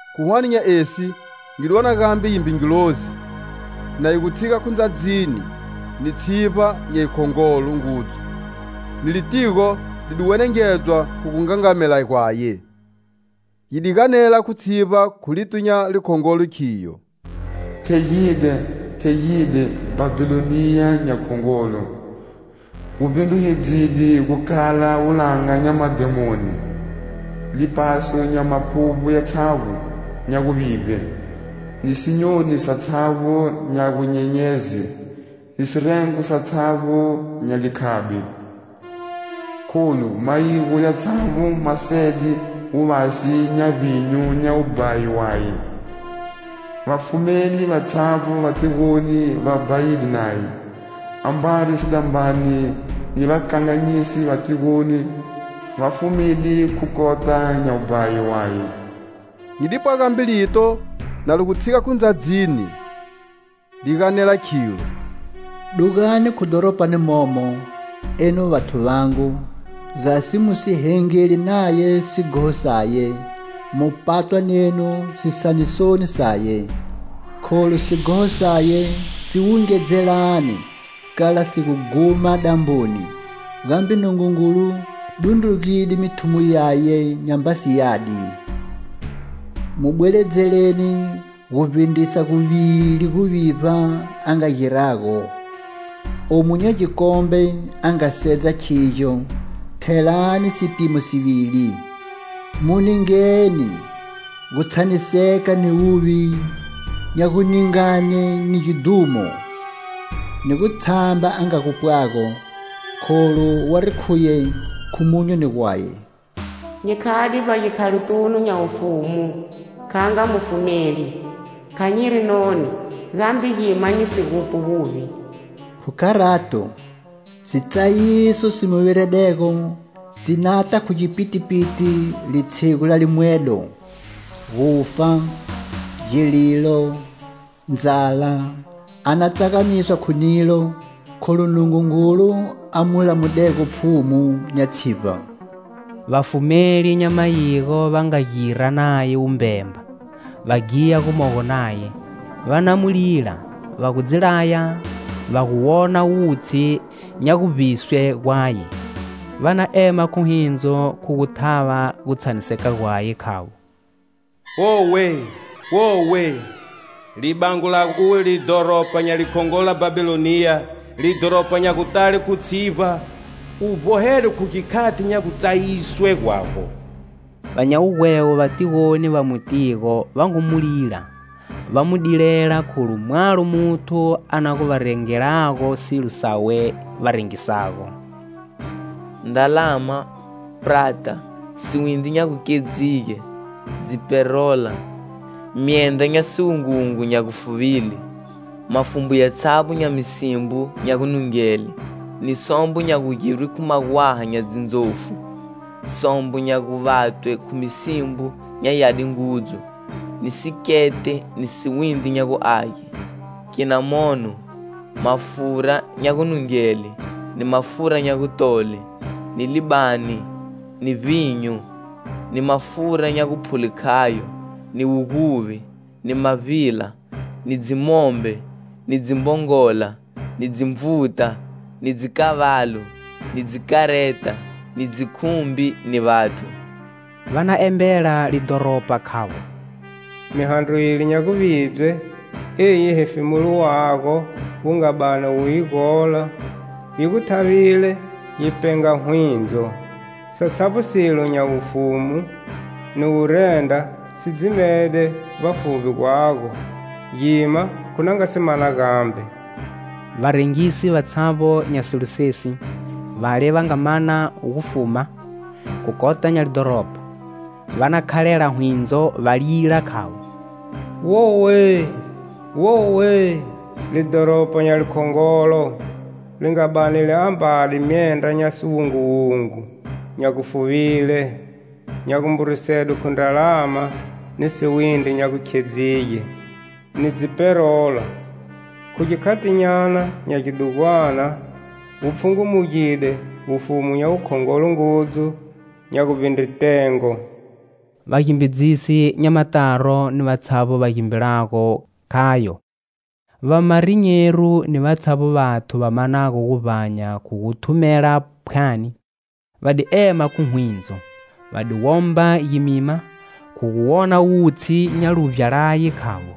Khu hwane nya esi nyi di wona gambe gimbe ngilozi na yi gu tshiga khu ndzadzini ni tshivba nya yikhongolo ngudzu, ni litigo li di wenengedzwa khu gungangamela gwaye. Yi di ganela khu tshivba khu lito nya likhongolo khiyo: "Thegide, thegide Bhabhiloniya nya khongolo,gu vbindrugedzide gu khala wulanga nya madhemoni,lipaso nya maphuvbo yatshavbo nya guvivbe,ni sinyoni satshavbo nya gunyenyeze,ni sirengo satshavbo nya likhabi. Kholu mayigo yatshavbo ma sede wuvasi nya vbinyu nya wubhayi waye.Vafumeli vatshavbo va tigoni va bhayide naye.Ambari sidambane ni vakanganyisi va tigoni va fumide khu kota nya wubhayi waye." Nyi dipwa gambe lito na li gu tshiga khu ndzadzini li ganela khilo: "Dugani khu dhoropani momo, enu vathu vangu,gasi mu si hengeli naye sighoho saye, mu patwa nenu sitsayisoni saye. Kholu sighoho saye si wungedzelane kala si gu ghuma damboni,gambe Nungungulu dundrugide mithumo yaye nyambasi yadi. Mu bweledzeleni gu vbindrisa guvili guvivba a nga girago.Omu nya gikombe a nga sedza khigyo, thelani sipimo sivili. Mu ningeni gutshaniseka ni wuvi nya guningane ni gidhumo,ni gutshamba a nga gupwago, kholu wari khuye khu monyoni gwaye: 'Nyi khade vbagikhalotunu nya wufumu kha nga mufumeli,kha nyiri noni, gambe gima nyi si gupwi wuvi'. Khu kharato sitsayiso si mu viredego si nata khu gipitipiti litshigu la limwedo:gufa, gililo, ndzala, a na tsagamiswa khu nilo,kholu Nungungulu a mu lamudego Pfhumu nya tshivba." Vafumeli nya mayigo va nga gira naye wubhemba, va ghiya gumogo naye, va na mu lila va gu dzi laya va gu wona wutshi nya guvbiswe gwaye. Va na ema khu hwindzo khu gu thava gutshaniseka gwaye, khavo: "Wowe, Wowe! Libango lago uwe lidhoropa nya likhongolo la Bhabhiloniya, lidhoropa nya gutale khu tshivba, u vbohedwe khu gikhati nya gutsayiswe gwago." Va nya wugwevo va tigoni va mutigo va ngu mu lila va mu dilela kholu mwalo muthu a na gu va rengelago silo sawe va rengisago: ndralama, prata, siwindri nya gukhedzige, dziperola, myendra nya siwunguwungu nya gufuvile, mafumbu yatshavbo nya misimbo nya gunungele, ni sombo nya gugirwe khu magwaha nya dzindzofu, sombo nya guvatwe khu misimbo nya yadi ngudzu, ni sikete ni siwindri nya gu age, kinamono, mafura nya gunungele, ni mafura nya gutole, ni libani, ni vbinyu, ni mafura nya guphule khayo, ni wuguvbi, ni mavbila, ni dzimombe, ni dzimbongola, ni dzinvuta, ni dzikavalu, ni dzikareta, ni dzikhumbi ni vathu. Va na embela lidhoropa khavo: "Mihandro yile nya guvidzwe eyi hefemulo wago wu nga bani wu yi gola, yi gu thavile yi penga hwindzo; satshavbo silo nya wufumu ni wurendra si dzimede vbafuvbi gwago, gima khu na nga si mana gambe." Varengisi vatshavbo nya silo sesi, vale va nga mana gufuma khu kota nya lidhoropa, va na khalela hwindzo, va lila khavo: "Wowe, Wowe! Lidhoropa nya likhongolo, li nga bani li ambade myendra nya siwunguwungu, nya gufuvile, nya gumburisedwe khu ndralama, ni siwindri nya gukhedzige, ni dziperola. Khu gikhatinyana nya gi dugwana wu pfhungumugide wufumu nya wukhongolo ngudzu nya guvbindre tengo!" Vagimbidzisi nya mataro ni vatshavbo va gimbilago khayo, vamarinyero ni vatshavbo vathu va manago guvbanya khu gu thumela phwani, va di ema khu hwindzo, va di womba gimima khu gu wona wutshi nya luvbya laye, khavo: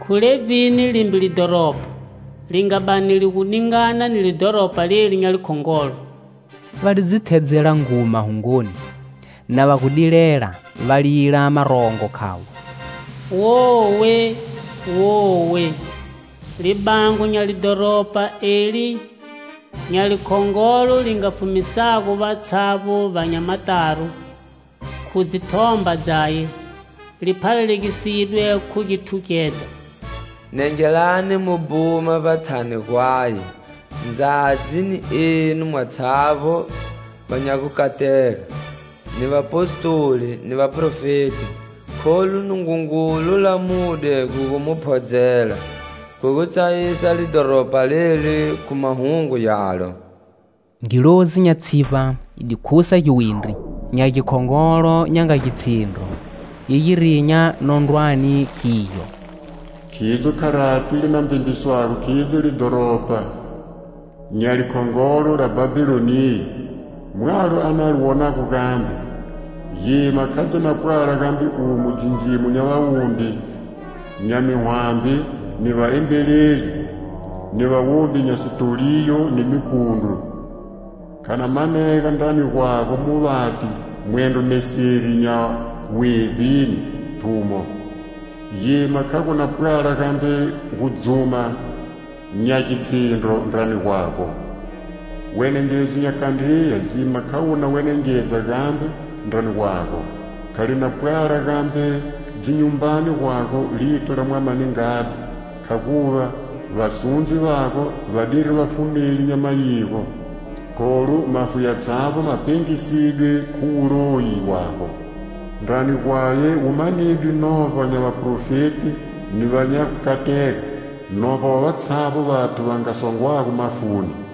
"Khu levbini limbe lidhoropa li nga bani li gu ningana ni lidhoropa leli nya likhongolo?" Va di dzi thedzela nguma hungoni, na va gu dilela, valila marongo khavo: "Wowe, Wowe! Libango nya lidhoropa eli nya likhongolo li nga fumisago vatshavbo va nya mataro khu dzi thomba dzaye, liphalalegisidwe khu githugedza." Nengelani mu bhuma vbatshani gwaye, ndzadzi, ni enu mwatshavbo va nya gukatega, ni vapostoli, ni vaphrofeti. Kholu Nungungulu lamude khu gu mu phodzela, khu gu tsayisa lidhoropa leli khu mahungu yalo. Ngilozi nya tshivba yi di khusa giwindri, nya gikhongolo nya nga gitshindro yi gi rinya nondrwani, khiyo: "Khidzo kharati li na mbembiswago khidzo lidhoropa nya likhongolo la Bhabhiloniya; mwalo a na li wonago gambe. Gima kha dzi na pwala gambe umo dzindzimo nya vawombi nya mihwambi, ni vaembeleli, ni vawombi nya sitoliyo ni mipundru. Kha na manega ndrani gwago muvati mwendro meseri nya wevbini thumo, gima kha gu na pwala gambe gudzuma nya gitshindro ndrani gwago. Wenengedzo nya kandriya gima kha wu na wenengedza gambe ndrani gwago, kha li na pwala gambe dzinyumbani gwago lito la mwama ni ngadzi, khaguva vasundzi vago vadiri vafumeli nya mayigo, kholu mafu yatshavbo ma pengisidwe khu wuloyi wago." Ndrani gwaye wu manidwe novba nya vaprofeti ni va nya gukatega, novba wa vatshavbo vathu va nga songwago mafuni.